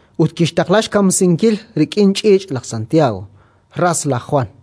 ut kixtaqla xkamsinkil rik'in ch'iich' laj Santiago, ras laj Jwan.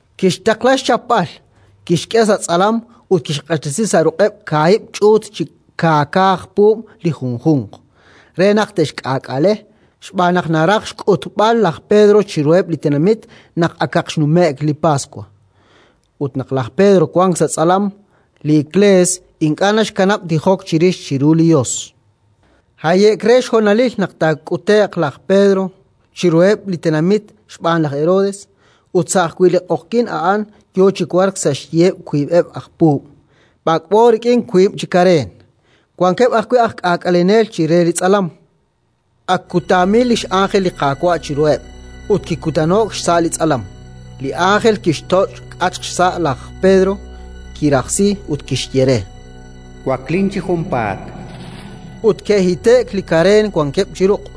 Kixtaqla xchapb'al, kixk'e sa' tz'alam ut kixq'axtesi sa' ruq'eb' kaahib' ch'uut chi kaaka aj puub' li junjunq, re naq te'xk'aak'ale, xb'aan naq naraj xk'utb'al laj Pedro chiruheb' li tenamit naq akaq xnume'k li Paswa. Ut naq laj Pedro wank sa' tz'alam, li Iklees ink'a' naxkanab' tijok chirix chiru li Yos. Haye'k re xhonalil naq taak'ute'q laj Pedro chiruheb' li tenamit xb'aan laj Herodes, ut sa' ajwi' li q'oqyink a'an yo chi wark sa' xyiheb' wiib'eb' aj puub', b'ak'b'o rik'in wiib' chi kareen. Wankeb' ajwi' aj k'aak'alenel chire li tz'alam, ak k'utaamil li x'ánjel li Qaawa' chiruheb' ut kikutano'k xsa' li tz'alam. Li ánjel kixtoch' xk'atq xsa' laj Pedro, kirajsi ut kixye re: “Waklin chi junpaat”. Ut ke'hite'k li kareen wankeb' chi ruq'.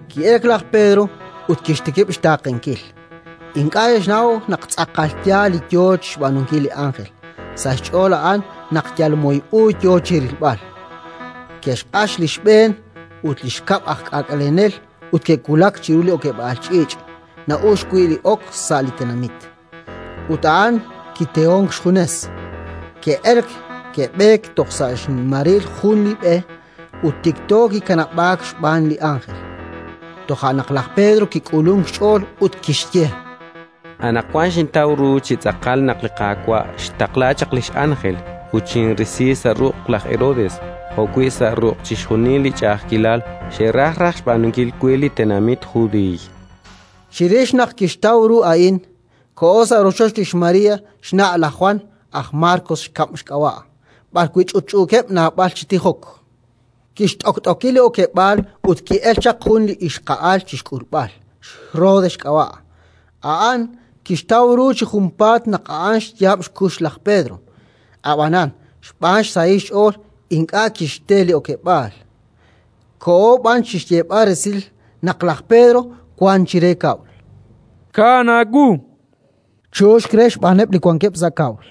Ki'elk laj Pedro ut kixtikib' xtaaqenkil: ink'a' naxnaw naq tz'aqal yaal li yo chi xb'aanunkil li ánjel; sa' xch'ool a'an naq yal moy u yo chi rilb'al. Ke'xq'ax li xb'een ut li xkab' aj k'aak'alenel ut ke'wulak chiru li okeb'aal ch'iich' na'uxk wi' ok sa' li tenamit; ut a'an kitehonk xjunes. Ke'elk, ke'b'eek toj sa' xmaril jun li b'e, ut tikto kikanab'aak xb'aan li ánjel. Toja' naq laj Pedro kik'ulunk xch'ool ut kixye: “Anaqwan xintaw ru chi tz'aqal naq li Qaawa' xtaqla chaq li x'ánjel ut xinrisi sa' ruq' laj Herodes jo'wi' sa' chixjunil li ch'a'ajkilal xe'raj raj xb'aanunkil we li tenamit Judiiy”. Chirix naq kixtaw ru a'in, koho sa' rochoch lix María, xna' laj Jwan, aj Markos xkab' xk'ab'a', A'an li xkab' evangelista. b'arwi' ch'utch'uukeb' naab'al chi tijok. Kixt'okt'oki li okeb'aal ut ki'elk chaq jun li ixqa'al chi xk'ulb'al, xRode xk'ab'a'. A'an kixtaw ru chi junpaat naq a'an xyaab' xkux laj Pedro, ab'anan xb'aan xsahil xch'ool ink'a' kixte li okeb'aal, koho b'an chi xyeeb'al resil naq laj Pedro wank chire kab'l. —Kaan aawu, chu'uxk re xb'aaneb' li wankeb' sa' kab'l.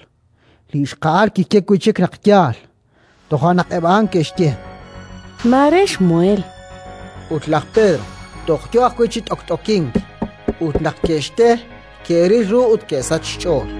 Li ixqa'al kixye wi' chik naq yaal. Toja' naq eb' a'an ke'xye: —Mare xmuheel. Ut laj Pedro toj yo ajwi' chi t'okt'okink. Ut naq ke'xte, ke'ril ru ut ke'sachk xch'ool.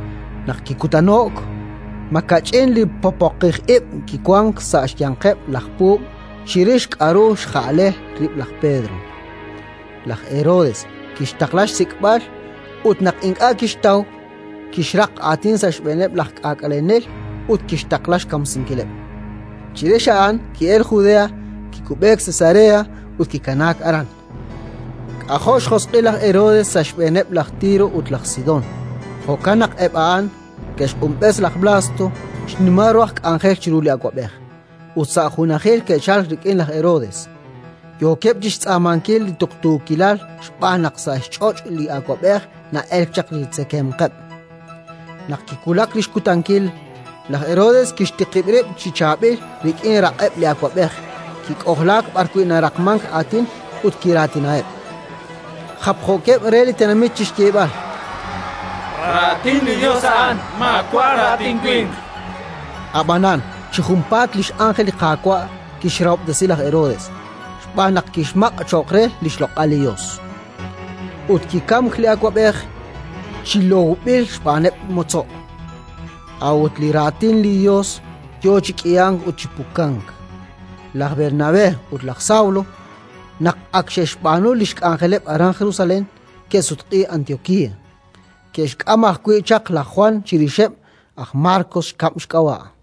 Naq kikutano'k, makach'in li poqoqij ib' kiwank sa' xyanqeb' laj puub' chirix k'aru xja'le rib' laj Pedro. Laj Herodes kixtaqla xsik'b'al ut, naq ink'a' kixtaw, kixraq aatin sa' xb'eeneb' laj k'aak'alenel ut kixtaqla xkamsinkileb'. Chirix a'an ki'elk Judea, kikub'eek Cesarea ut kikanaak aran. K'ajo' xjosq'il laj Herodes sa' xb'eeneb' laj Tiro ut laj Sidón. Jo'kan naq eb' a'an ke'xq'unb'es laj Blasto, xnimal ru aj k'anjel chiru li awab'ej, ut sa' junajil ke'chalk rik'in laj Herodes, yookeb' chi xtz'aamankil li tuqtuukilal xb'aan naq sa' xch'och' li awab'ej na'elk li xtzekemqeb'. Naq kiwulak li xkutankil, laj Herodes kixtiqib' rib' chi chaab'il rik'in raq'eb' li awab'ej, kik'ojlaak b'arwi' naraqmank aatin ut kiraatinaheb', japjookeb' re li tenamit chi xyeeb'al: “Raatin li Yos a'an, maawa' raatin winq!”. Ab'anan chi junpaat li x'ánjel li Qaawa' kixrahob'tesi laj Herodes, xb'aan naq kixmaq' cho'q re li xloq'al li Yos. Ut kikamk li awab'ej, chi lowb'il xb'aaneb' motzo'. A'ut li Raatin li Yos yo chi k'ihank ut chi pukank. Laj Bernabé ut laj Sawlo, naq ak xe'xb'aanu li xk'anjeleb' aran Jerusalén, ke'sutq'iik Antiokía. Ke'xk'am ajwi' chaq laj Jwan chirixeb', aj Markos xkab' xk'ab'a'.